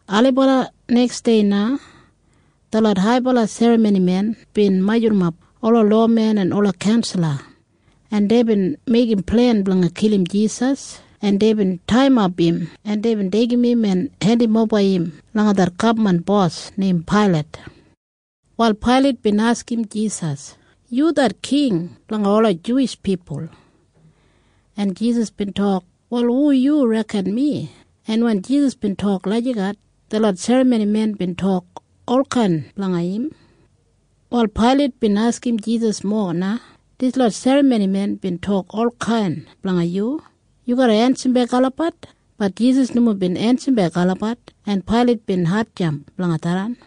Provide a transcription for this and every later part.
Ailibala neksdei na detlot haibala serramonimen bin majurrumap ola lowamen en ola kaunsala, en deibin meigim plen blanga kilim Jisas, en deibin taiyimap im, en deibin deigim im en hendimoba im langa det gabman bos neim Pailat. Wal Pailat bin askim Jisas, “Yu det king blanga ola Juwish pipul?” En Jisas bin tok, “Wal hu yu reken mi?” En wen Jisas bin tok lagijat, detlot serramonimen bin tok olkain blanga im. Wal Pailat bin askim Jisas mowa na, “Dislot serramonimen bin tok olkain blanga yu. Yu garra ensimbek olabat?” Bat Jisas nomo bin ensimbek olabat, en Pailat bin hatjamp blanga tharran.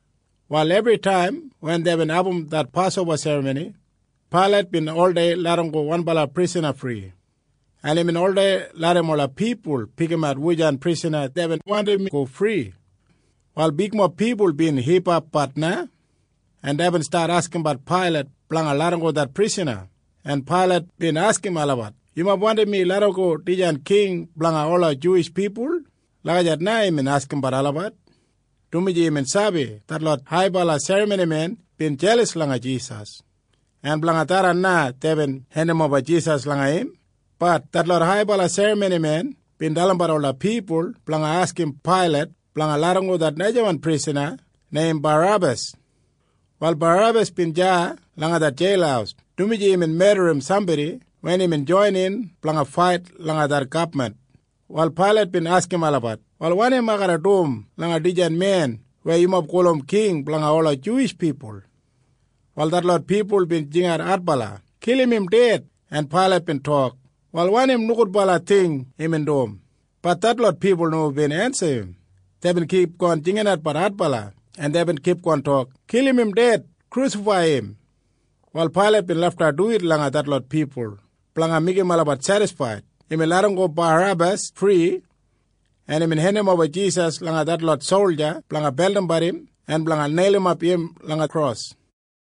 Wal ebritaim wen deibin abum det Pasoba Serramoni, Pailat bin oldei larramgo wanbala prisana fri, en imbin oldei larram ola pipul pikimat wujan prisana deibin wandim go fri. Wal bigmob pipul bin hipapbat na, en deibin stat askimbat Pailat blanga larramgo det prisana, en Pailat bin askim olabat, “Yumob wandim mi larramgo dijan king blanga ola Juwish pipul?” Lagijat na imbin askimbat olabat, dumaji imbin sabi detlot haibala serramonimen bin jelas langa Jisas, en blanga tharran na deibin hendimoba Jisas langa im. Bat detlot haibala serramonimen bin dalimbat ola pipul blanga askim Pailat blanga larramgo det najawan prisana neim Barebas. Wal Barebas bin deya langa det jeil, dumaji imbin medrim sambodi wen imbin joinin blanga fait langa det gabman. Wal Pailat bin askim olabat, “Wal wanim ai garra dum langa dijan men weya yumob gulum king blanga ola Juwish pipul?” Wal detlot pipul bin jingat adbala, “Kilim im ded!” En Pailat bin tok, “Wal wanim nogudbala ting imbin dum?” Bat detlot pipul nomo bin ensim im. Deibin kipgon jinginatbat adbala, en deibin kipgon tok, “Kilim im! Kilim im ded!” Wal Pailat bin lafta duwit langa detlot pipul blanga meigim olabat sedisfaid. Imbin larramgo Barebas fri, en imbin hendimoba Jisas langa detlot solja blanga beldimbat im en blanga neilimap im langa kros.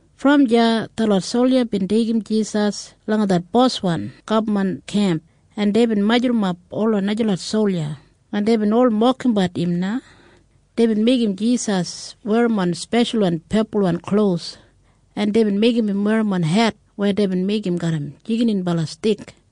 Brom deya detlot solja bin deigim Jisas langa det boswan gabman kemp, en deibin majurrumap ola najalot solja, en deibin ol mokimbat im na. Deibin meigim Jisas werrimon speshalwan pepulwan klos, en deibin meigim im werrimon het weya deibin meigim garram jigininbala stik,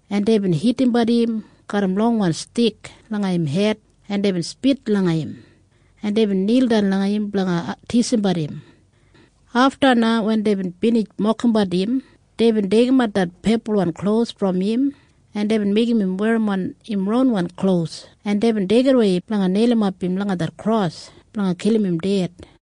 En deibin hitimbat im garram longwan stik langa im hed, en deibin spit langa im, en deibin nildan langa im blanga tisimbat im. Afta na wen deibin binij mokimbat im, deibin deigimat det pepulwan klos brom im, en deibin meigim im werrimon im ronwan klos, en deibin deigimwei im blanga neilimap im langa det kros blanga kilim im ded.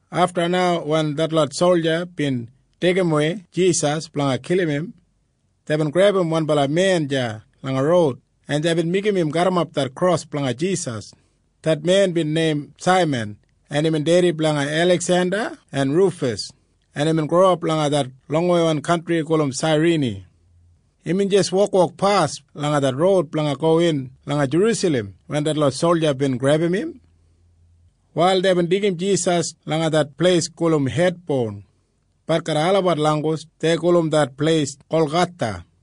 Afta na wen detlot solja bin deigimwei Jisas blanga kilim im, deibin grebum wanbala men deya langa roud, en deibin meigim im garrimap det kros blanga Jisas. Det men bin neim Saiman, en imbin dedi blanga Eliksenda en Rufas, en imbin growap langa det longweiwan kantri gulum Sairini. Imbin jis wokwokpas langa det roud blanga gowin langa Jerusalem wen detlot solja bin grebum im. Wal deibin deigim Jisas langa det pleis gulum Hed Boun. Bat garram olabat langgus dei gulum det pleis Golgatha.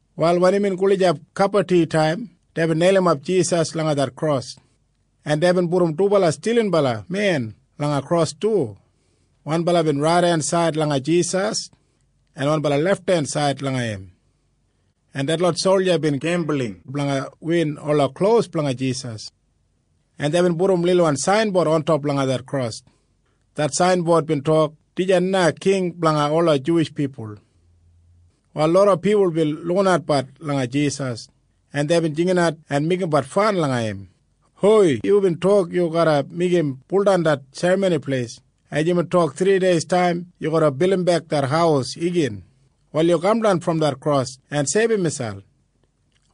Wal wen imbin gulijap kabaditaim, deibin neilimap Jisas langa det kros, en deibin pudum dubala stilinbala men langa kros du, wanbala raidensaid langa Jisas en wanbala lefthensaid langa im, en detlot solja bin gembul blanga win ola klos blanga Jisas, en deibin pudum lilwan sainbod ontop langa det kros. Det sainbod bin tok, “Dijan na king blanga ola Juwish pipul.” Wal loda pipul bin lukinatbat langa Jisas, en deibin jinginat en meigimbat fan langa im, “Hoi! Yubin tok yu garra meigim buldan det Serramoni Pleis, en yubin tok thrideistaim yu garra bildimbek det haus igin. Wal yu kamdan brom det kros en seibum miselp.”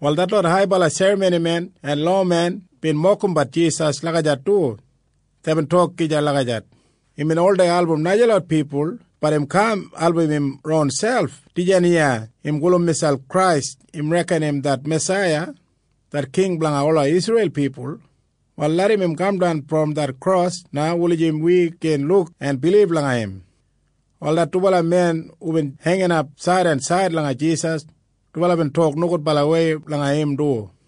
Wal detlot haibala serramonimen en lowamen bin mokimbat Jisas lagijat du. Deibin tok gija lagijat, “Imbin oldei album najalot pipul. Bat im kaan album im ronselp. Dijan iya im gulum miselp Krais. Im reken im det Masaiya, det king blanga ola Isreil pipul. Wal larram im kamdan brom det kros na en wi gin luk en bilib langa im.” Wal det dubala men hubin heinginap said en said langa Jisas, dubala bin tok nogudbalawei langa im du.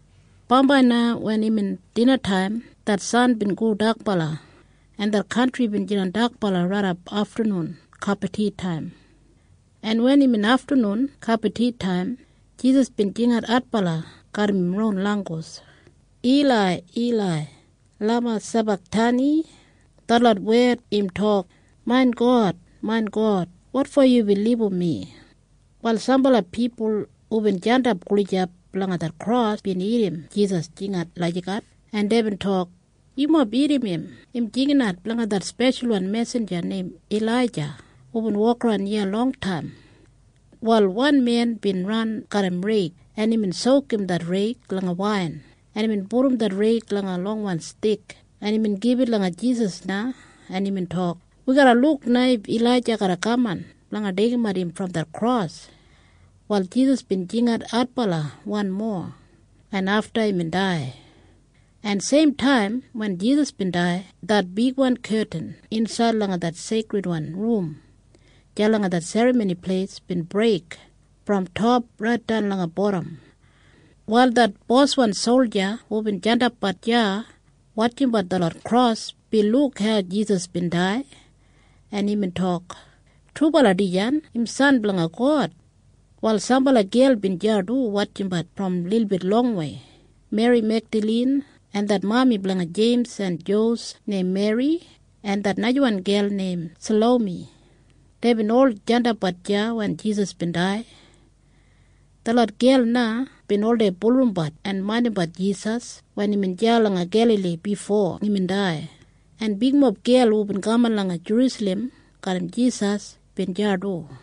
Bambai na wen imbin dinataim, det san bin go dakbala, en det kantri bin jidan dakbala raidap aftanun kabaditaim, en wen imbin aftanun kabaditaim, Jisas bin jingat adbala garram im ron langgus, “Ilai, Ilai, lama sabaktani?” Detlot wed im tok, “Main God, main God, wotfo yubin libum mi?” Wal sambala pipul hubin jandap gulijap langa det kros bin irrim Jisas jingat lagijat, en deibin tok, “Yumob irrim im. Im jinginat blanga det speshalwan mesinja neim Ilaija hubin wokaran iya longtaim.” Wal wan men bin ran garram reig, en imbin sokum det reig langa wain, en imbin pudum det reig langa longwan stik, en imbin gibit langa Jisas na, en imbin tok, “Wi garra luk na if Ilaija garra kaman blanga deigimat im brom det kros.” Wal Jisas bin jingat adbala wanmo, en afta imbin dai. En seimtaim wen Jisas bin dai, det bigwan ketin insaid langa det seikridwan rum deya langa det Serramoni Pleis bin breik brom top raitdan langa bodam. Wal det boswan solja hubin jandapbat deya wotjimbat detlot kros bin luk hau Jisas bin dai, en imbin tok, “Trubala dijan im San blanga God!” Wal sambala gel bin deya du wotjimbat brom lilbit longwei. Meri Megdalin en det mami blanga Jeims en Josef neim Meri en det najawan gel neim Salomi, deibin ol jandapbat deya wen Jisas bin dai. Detlot gel na bin oldei bulurrumbat en maindimbat Jisas wen imbin deya langa Gelali bifo imbin dai. En bigmob gel hubin kaman langa Jerusalem garram Jisas bin deya du.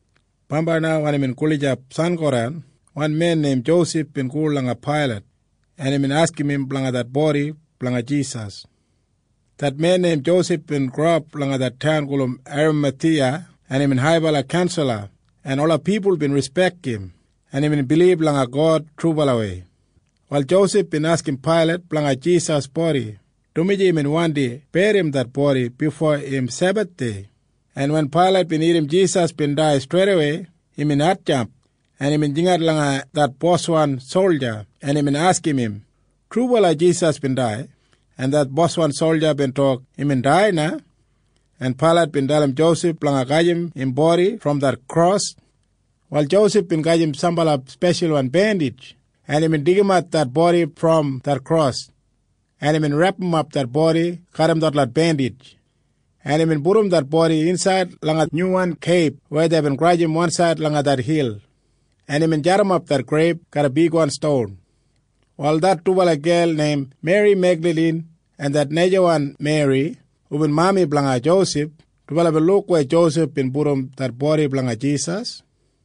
Bambai na wen imbin gulijap sangodan, wan men neim Josef bin go langa Pailat, en imbin askim im blanga det bodi blanga Jisas. Det men Josef bin growap langa det taun gulum Eramathiya, en imbin haibala kaunsala en ola pipul bin rispek im, en imbin bilib langa God trubalawei. Wal Josef bin askim Pailat blanga Jisas bodi, dumaji imbin wandi berrim det bodi bifo imbin Sebathdei, en wen Pailat bin irrim Jisas bin dai streidawei, imbin hatjamp, en imbin jingat langa det boswan solja, en imbin askim im, “Trubala Jisas bin dai?” En det boswan solja bin tok, “Imbin dai na.” En Pailat bin dalim Josef blanga gajim im bodi brom det kros. Wal Josef bin gajim sambala speshalwan bendij, en imbin pulumdan det bodi brom det kros, en imbin repdimap det bodi garram detlot bendij, en imbin pudum det bodi insaid langa nyuwan keib weya deibin grajim wansaid langa det hil, en imbin jadimap det greib garram bigwan ston. Wal det dubala gel neim Meri Megdalin en det najawan Meri hubin mami blanga Josef, dubala bin luk weya Josef bin pudum det bodi blanga Jisas.